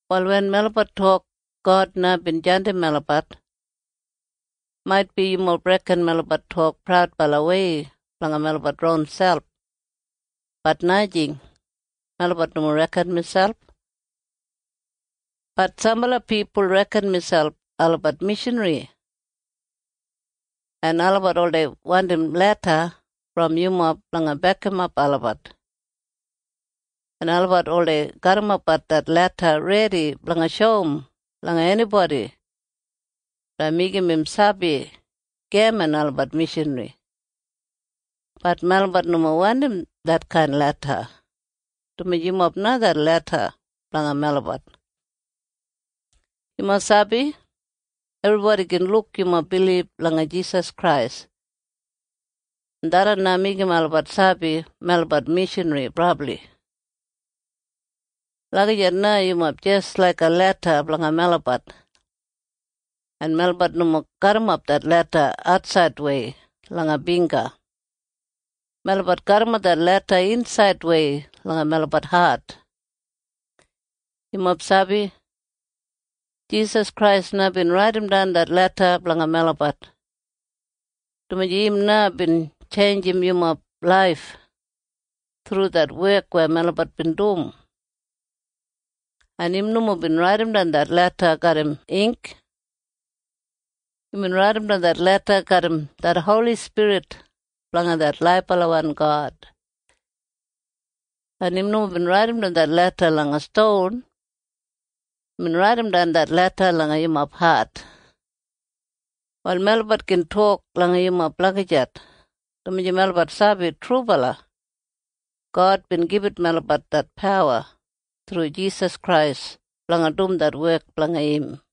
Wal wen melabat tok God na bin jandim melabat, maitbi yumob reken melabat tok praudbalawei blanga melabat ronselp. Bat najing. Melabat nomo reken miselp. Bat sambala pipul reken miselp olabat mishanri. En olabat oldei wandim leda brom yumob blanga bekimap olabat, en olabat oldei garrimapbat det leda redi blanga shoum langa enibodi blanga meigim im sabi geman olabat mishanri. Bat melabat nomo wandim detkain leda, dumaji yumob na det leda blanga melabat. Yumob sabi? Ebribodi gin luk yumob bilib langa Jisas Krais, en tharran na meigim olabat sabi melabat mishanri brabli. Lagijat na yumob jis laiga leda blanga melabat. En melabat nomo garrimap det leda atsaidwei langa bingga. Melabat garrimap det leda insaidwei langa melabat hat. Yumob sabi? Jisas Krais na bin raidimdan det leda blanga melabat, dumaji im na bin tjeinjim yumob laif thru det wek weya melabat bin dum. En im nomo bin raidimdan det leda garram ink. Imbin raidimdan det leda garram det Holi Spirit blanga det laibalawan God. En im nomo bin raidimdan det leda langa ston. Imbin raidimdan det leda langa yumob hat. Wal melabat gin tok langa yumob lagijat, dumaji melabat sabi trubala God bin gibit melabat det pawa thru Jisas Krais blanga dum det wek blanga im.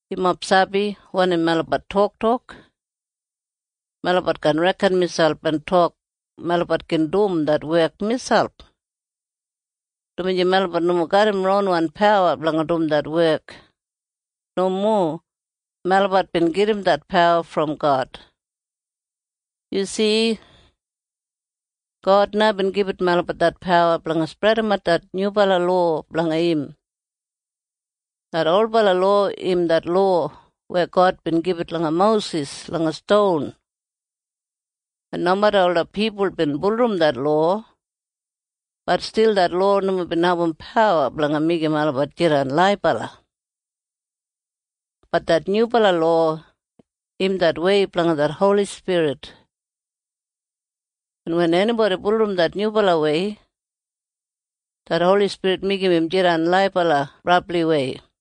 Yumob sabi wanim melabat toktok? Melabat kaan reken miselp en tok melabat gin dum det wek miselp, dumaji melabat nomo garram ronwan pawa blanga dum det wek. Nomo. Melabat bin gedim det pawa brom God. Yu si? God na bin gibit melabat det pawa blanga spredimat det nyubala lowa blanga im. Det olbala lowa im det lowa weya God bin gibit langa Mosis langa ston. En nomeda ola pipul bin bulurrum det lowa, bat stil det lowa nomo bin abum pawa blanga meigim olabat jidan laibala. Bat det nyubala lowa im det wei blanga det Holi Spirit. En wen enibodi bulurrum det nyubalawei, det Holi Spirit meigim im jidan laibala brabliwei.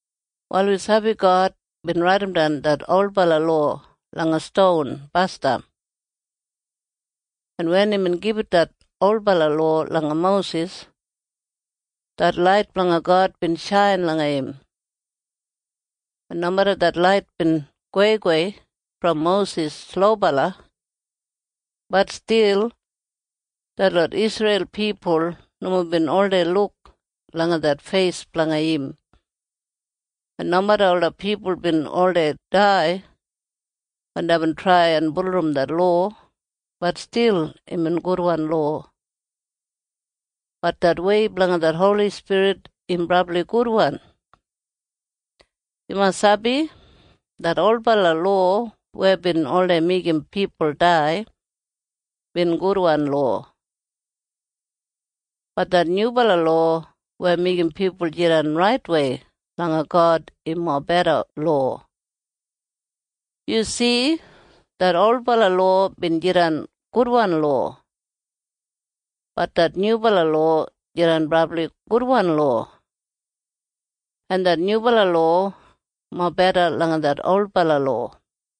Wal wi sabi God bin raidimdan det olbala lowa langa ston basdam, en wen imbin gibit det olbala lowa langa Mosis, det lait blanga God bin shain langa im, en nomeda det lait bin goweigowei brom Mosis slobala, bat stil detlot Isreil pipul nomo bin oldei luk langa det feis blanga im. En nomeda ola pipul bin oldei dai wen deibin trai en bulurrum det lowa, bat stil imbin gudwan lowa. Bat det wei blanga det Holi Spirit im brabli gudwan. Yumob sabi? Det olbala lowa weya bin oldei meigim pipul dai bin gudwan lowa. Bat det nyubala lowa weya meigim pipul jidan raitwei langa God im mobeda lowa. Yu si? Det olbala lowa bin jidan gudwan lowa. Bat det nyubala lowa jidan brabli gudwan lowa. En det nyubala lowa mobeda langa det olbala lowa.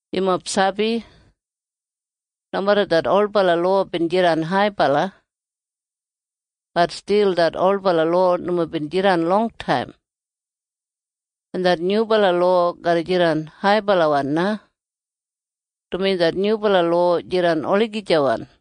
Yumob sabi? Nomeda det olbala lowa bin jidan haibala, bat stil det olbala lowa nomo bin jidan longtaim. En det nyubala lowa garra jidan haibalawan na, dumaji det nyubala lowa jidan olagijawan.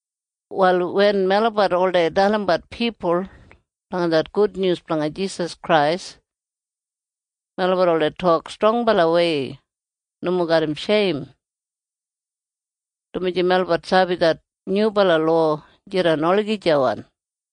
Wal wen melabat oldei dalimbat pipul blanga det gudnyus blanga Jisas Krais, melabat oldei tok strongbalawei nomo garram sheim, dumaji melabat sabi det nyubala lowa jidan olagijawan.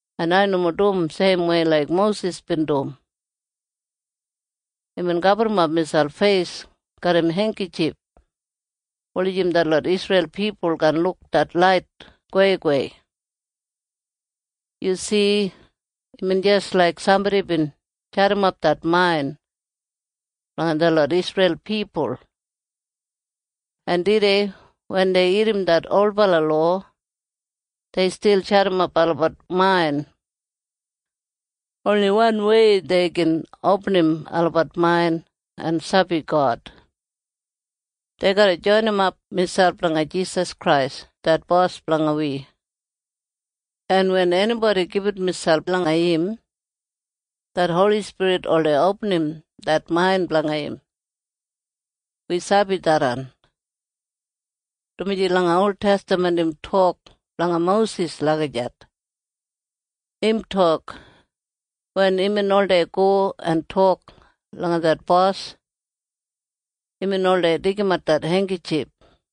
Ai nomo dum seimwei laik Mosis bin dum. Imbin gaburrumap miselp feis garram heinggitjif wulijim detlot Isreil pipul kaan luk det lait goweigowei. Yu si? Imbin jis laik sambodi bin jadimap det main blanga detlot Isreil pipul. En tudei wen dei irrim det olbala lowa, dei stil jadimap olabat main. Oni wanwei dei gin opinim olabat main en sabi God. Dei garra joinimap miselp langa Jisas Krais det Bos blanga wi. En wen enibodi gibit miselp langa im, det Holi Spirit oldei opinim det main blanga im. Wi sabi tharran, dumaji langa oltestaman im tok blanga Mosis lagijat. Im tok, “Wen imbin oldei go en tok langa det Bos, imbin oldei deigimat det heinggitjif.”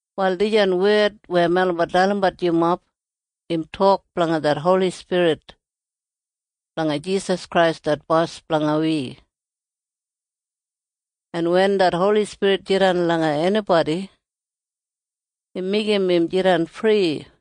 Wal dijan wed weya melabat dalimbat yumob im tok blanga det Holi Spirit blanga Jisas Krais det Bos blanga wi. En wen det Holi Spirit jidan langa enibodi, im meigim im jidan fri.